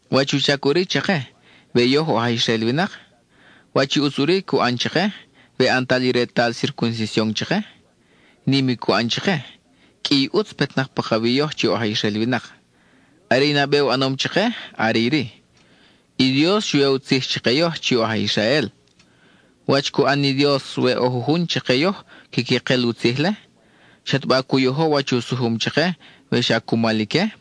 ¿Wach u chac ʼuri chake, we yoj oj aj Israel winak? ¿Wach i ʼutz ʼuri cu ʼan chake we ʼantal i retal circuncision chake? Nim i cu ʼan chake; qʼui i ʼutz petnak pakawi yoj chi oj aj Israel winak. Are i nabe u ʼanom chake are iri: i Dios xu ya u tzij chake yoj chi oj aj Israel. ¿Wach cu ʼan ni Dios we ʼo jujun chake yoj quiqui kel u tzij-le? ¿Xataba cu yojo wach u sujum chake we xa cumal ique?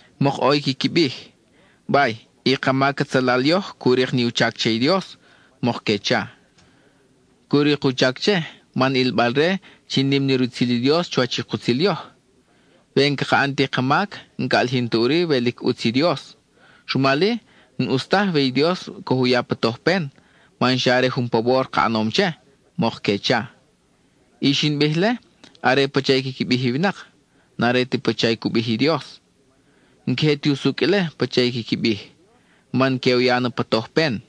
Mok ʼo i quiqui bij: “Bay, i ka mac atzalal yoj cu rik ni u chac che i Dios,” mok que cha. “Cu rik u chac che, man ʼilbal-re chi nim ni rutzil i Dios chuwach i kutzil yoj. We n-caka ʼan ti ka mac, n-ca ʼalijin ta ʼuri we lic ʼutz i Dios. Rumal-i, n-ʼus taj we i Dios coj u ya pa tojpen, man xa are jun pawor ka ʼanom che,” mok que cha. (I xin bij-le are pacha i quiqui bij i winak; n-are ti pacha cu bij i Dios.) N-queje ti usucʼ ile pacha i quiqui bij, man que u ya na pa tojpen.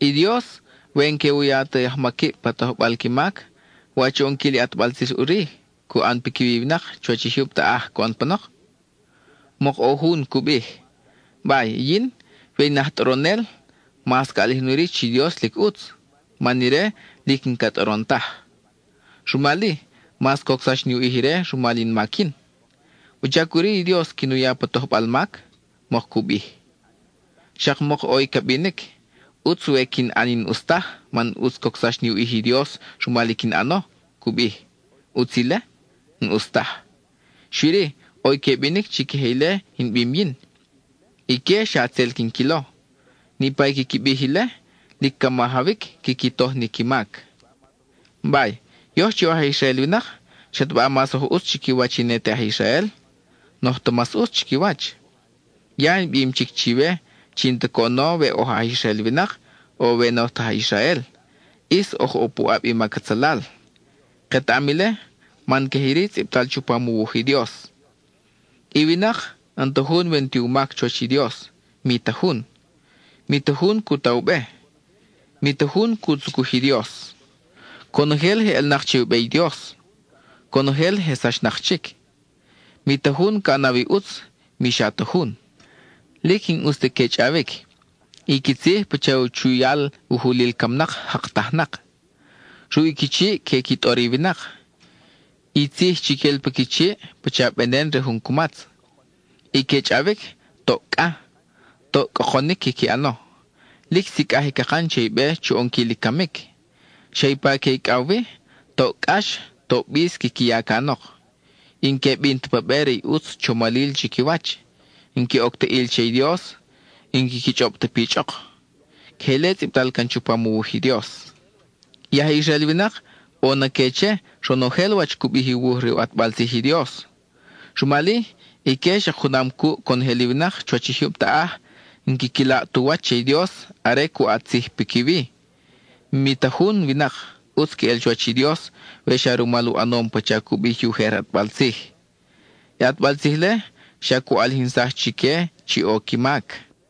I Dios, we n-que u ya ti ajmaquib pa tojbal qui mac ¿wach u ʼonquil i ʼatbal tzij ʼuri cu ʼan piquiwi i winak chuwach i jyub taʼaj coʼon panok? Mok ʼo jun cu bij, “Bay, i yin, we in aj tʼoronel mas ca ʼalijin ʼuri chi Dios lic ʼutz, man ire lic n-ca tʼoron taj. Rumal-i, mas cocsax ni u ʼij ire rumal in mac yin. ¿Wuchac ʼuri i Dios quin u ya pa tojbal mac?” mok cu bij. Xak mok ʼo i ca binic: “ʼUtz we quin ʼan i n-ʼus taj, man ʼutz cocsax ni u ʼij i Dios rumal i quin ʼano,” cu bij. ¿ʼUtz ile? N-ʼus taj. Xui-ri, ʼo i que binic chi queje ile in bim yin; ique xa tzel quin quilo. Niʼpa i quiqui bij ile, lic ca majawic quiqui toj ni qui mac. Bay, yoj chi oj aj Israel winak ¿xataba mas oj ʼutz chiquiwach i ne te aj Israel? N-oj ta mas ʼutz chiquiwach. Ya in bim chic chiwe chi n-ta coʼono we oj aj Israel winak, o we n-oj ta aj Israel, ʼis oj ʼo puʼab i mac atzalal. Ketaʼam ile man queje iri tzʼibtal chupam u wuj i Dios: I winak, n-ta jun we n-ti u mac chuwach i Dios, mi ta jun; mi ta jun cu ta u be, mi ta jun cu tzucuj i Dios. Conojel je ʼelnak che u be i Dios; conojel je sachnak chic. Mi ta jun ca ʼanaw i ʼutz, mi xa ta jun. Lic n-ʼus ti que chʼawic; i qui tzij pacha u chuyal u julil camnak, jaktajnak; ruʼi qui chiʼ que qui tʼor i winak. I tzij chi quel pa qui chiʼ pacha venen re jun cumatz; i que chʼawic, toʼ cʼa; toʼ cʼokonic quiqui ʼano. Lic sicʼaj i cakan chi be chu ʼonquil i camic; xa ipa que icʼaw wi, toʼ cʼax, toʼ bis quiqui ya canok; n-que bin ta pa be re i ʼutz chomalil chiquiwach. N-que oc ta ʼil che i Dios, n-quiqui chʼob ta pichʼok. (Queje ile tzʼibtal can chupam u wuj i Dios.) I aj Israel winak, ʼo na que che, ronojel wach cu bij i wuj re u ʼatbal tzij i Dios. Rumal-i, ique xak junam cuʼ conojel i winak chuwach i jyub taʼaj, n-quiqui laʼ tu wach che i Dios are cu ʼat tzij piquiwi. Mi ta jun winak, ʼutz queʼel chuwach i Dios we xa rumal u ʼanom pacha cu bij i ujer ʼatbal tzij. I ʼatbal tzij-le xa cu ʼalijinsaj chique chi ʼo i qui mac.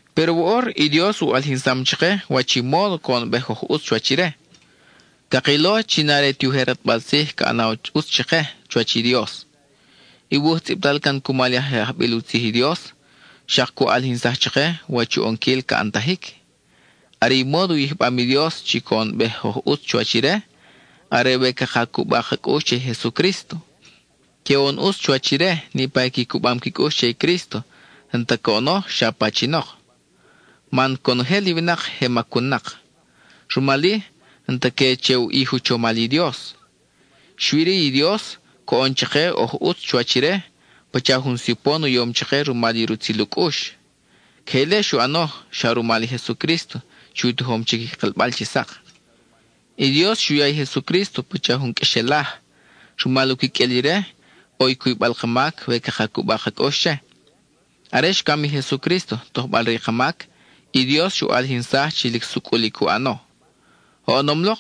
Péro woʼor i Dios u ʼalijinsam chake wach i módo coʼonbej oj ʼutz chuwach ire; cakilo chi n-are ti ujer ʼatbal tzij chi ca ʼanaw ʼutz chake chuwach i Dios. I wuj tzʼibtal can cumal i je ajbil u tzij i Dios, xak cu ʼalijinsaj chake wach u ʼonquil ca ʼantajic. Are i módo u yijbam i Dios chi coʼonbej oj ʼutz chuwach ire, are we caka cuba ka cʼux che i Jesucrísto. Que oʼon ʼutz chuwach ire niʼpa i qui cubam qui cʼux che i Crísto, n-ta coʼono xa pachinok. Man conojel i winak je macun-nak; rumal-i, n-ta que che u ʼij u chomal i Dios. Xui-ri i Dios, coʼon chake oj ʼutz chuwach ire, pacha jun sipon u yom chake rumal i rutzil u cʼux. Queje ile xu ʼano xa rumal i Jesucrísto chi u tojom chic i kelbal chi sak. I Dios xu ya i Jesucrísto pacha jun qʼuexelaj; rumal u quiqʼuel ire, ʼo i cuybal ka mac we caka cuba ka cʼux che. Are xcam i Jesucrísto tojbal-re i ka mac, i Dios xu ʼalijinsaj chi lic sucʼul i cu ʼano. Oʼonom-lok,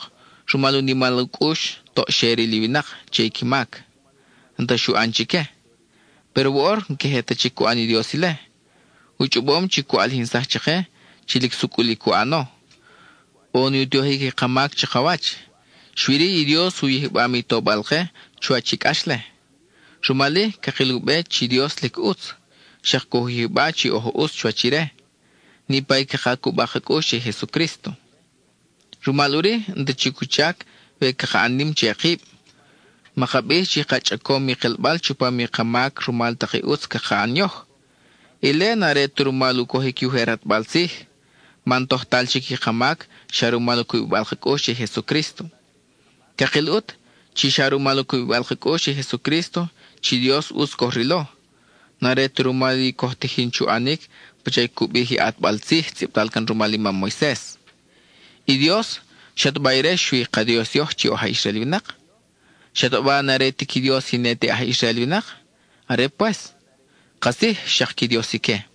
rumal u nimal u cʼux, toʼ xe ril i winak che i qui mac, n-ta xu ʼan chique. Péro woʼor, n-queje ta chic cu ʼan i Dios ile. U chʼobom chi cu ʼalijinsaj chake chi lic sucʼul i cu ʼano. ʼO ni u tojic i ka mac chakawach, xui-ri i Dios u yijbam i tobal-ke chuwach i cʼax-le. Rumal-i, cakil u be chi Dios lic ʼutz, xak coj u yijba chi oj ʼutz chuwach ire, niʼpa i caka cuba ka cʼux che i Jesucrísto. Rumal ʼuri, n-ta chic u chac we caka ʼan nim che kib; maka bij chi ka chʼacom i kelbal chupam i ka mac rumal tak i ʼutz caka ʼan yoj. Ile n-are ta rumal u cojic i ujer ʼatbal tzij, man tojtal chic i ka mac xa rumal u cubibal ka cʼux che i Jesucrísto. Cakil ʼut, chi xa rumal u cubibal ka cʼux che i Jesucrísto chi Dios ʼutz coj rilo; n-are ta rumal i coj tijin chu ʼanic pacha cu bij i ʼatbal tzij tzʼibtal can rumal i mam Moises. I Dios, ¿xataba ire xui i ka Dios yoj chi oj aj Israel winak? ¿Xataba n-are ti qui Dios i ne te aj Israel winak? ¡Are pues! Katzij xak qui Dios ique.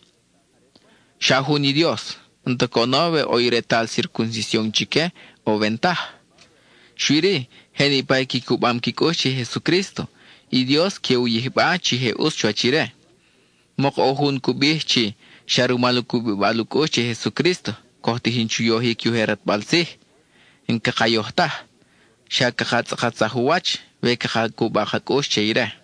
Xa jun i Dios; n-ta coʼono we ʼo i retal circuncision chique o we n-taj. Xui-ri, je niʼpa i qui cubam qui cʼux che i Jesucrísto, i Dios que u yijba chi je ʼutz chuwach ire. Mok ʼo jun cu bij chi, xa rumal u cubibal ka cʼux che i Jesucrísto, coj tijin chu yojic i ujer ʼatbal tzij. ¡N-caka yoj taj! Xa caka tzʼakatsaj u wach, we caka cuba ka cʼux che ire.